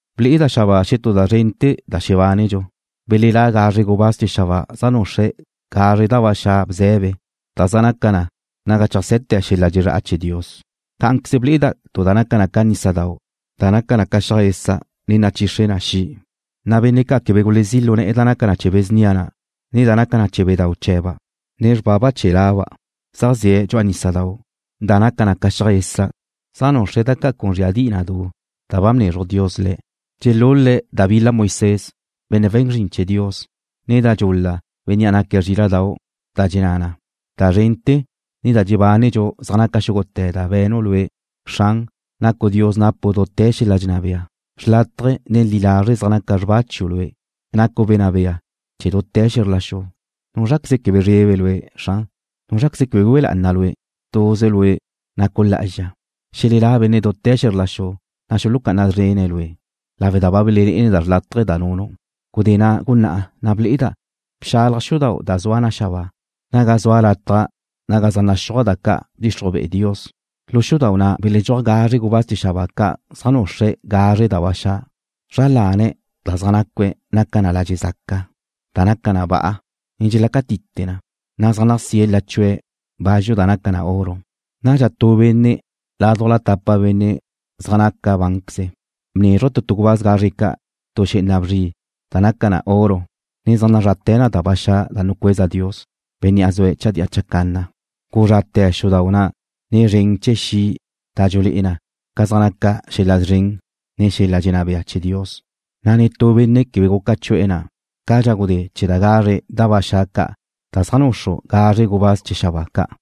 Ble'eda' xabáa xetú da zrente̱ da xebánedxu, belelá' gazre gubáz chee̱ xabáa zaj nuxre̱' gazre da ba xa' bze̱be, da zaj naca na naga cheajse̱te̱ xel-la' dxezrá'a chee̱ Dios. Cá'anqueze ble'eda' tu da naca na ca nísadau' da naca na ca xiaj esa', ne nachixre na xi', na' benne' ca' quebe gulezí lu ne̱'e̱ da naca na chee̱ be̱ snia na', ne da nacan chee̱ bedau' chee̱ba', ne xrbaba chee̱ laba', zaj ze̱' lu nísadau' na' da naca na ca xiaj esa', zaj nuxre̱' da ca' con zríadi'i na du da ba bnezruj Dios le̱'. Dxelul-le̱' da bil-la Moisés, benne' we̱n zrin chee̱ Dios, ne da dxul-la Bénnea' naque̱' Zríla'dau', da dxenná na: Da zrente̱, ne da dxebánedxu zaj naca xúgute̱ da ba be̱nu' Lue'. Xran, nacu' Dios napu' dute̱ xel-la' dxenná bea. Xrlátaje̱, ne li lazre' zaj naca xrba chiu' Lue'. Nacu' Wenná Bea chee̱ dute̱ xe̱zr la xu. ¿Núzraqueze quebe zrebe Lue', Xran? ¿Núzraqueze quebe güe lá'ana Lue'? Tuze Lue' nacu' lá'azxa. Xelelá' benne' dute̱ xe̱zr la xu, na' xulucá'ana szrene̱' Lue', lawe' da ba belelé'ene̱' da xrlátaje̱ da nunu'. Gudé na' gunná'a ne ble'eda' bxalaj xudau' da zua na xabáa, naga zua lataj naga zaj naxúaj da ca' bdxixruj be'e Dios. Lu xudau' na' beledxúaj gazre gubáz chee̱ xabáa ca' zaj nuxre̱' gazre da ba xa'. Zra lane̱' zaj nacue̱' naca na ladxe' zaca, da naca na ba'a, ne dxelácatite na, na' zaj nasíe̱' lachu'e̱ bazxu da naca na oro. Nadxa tu benne' laduj tapa benne' zaj naca bánqueze̱' bnézruje̱' tu tu gubáz gazre ca' tu xé'ena bzri da naca na oro, ne zaj nazrate̱ na da ba xa' da nucueza Dios, Bénnea' zue̱' chadía chacanna. Guzrate̱ xudau' na' nen zren chee̱ xi' da dxulé'e na ca zaj naca xel-la' szren, ne xel-la' dxenná bea chee̱ Dios, na' netú benne' quebe guca chu'e̱ ga na' cadxa gudé chee̱ da gazre da ba xa' ca' da zaj nuxru gazre gubáz chee̱ xabáa ca'.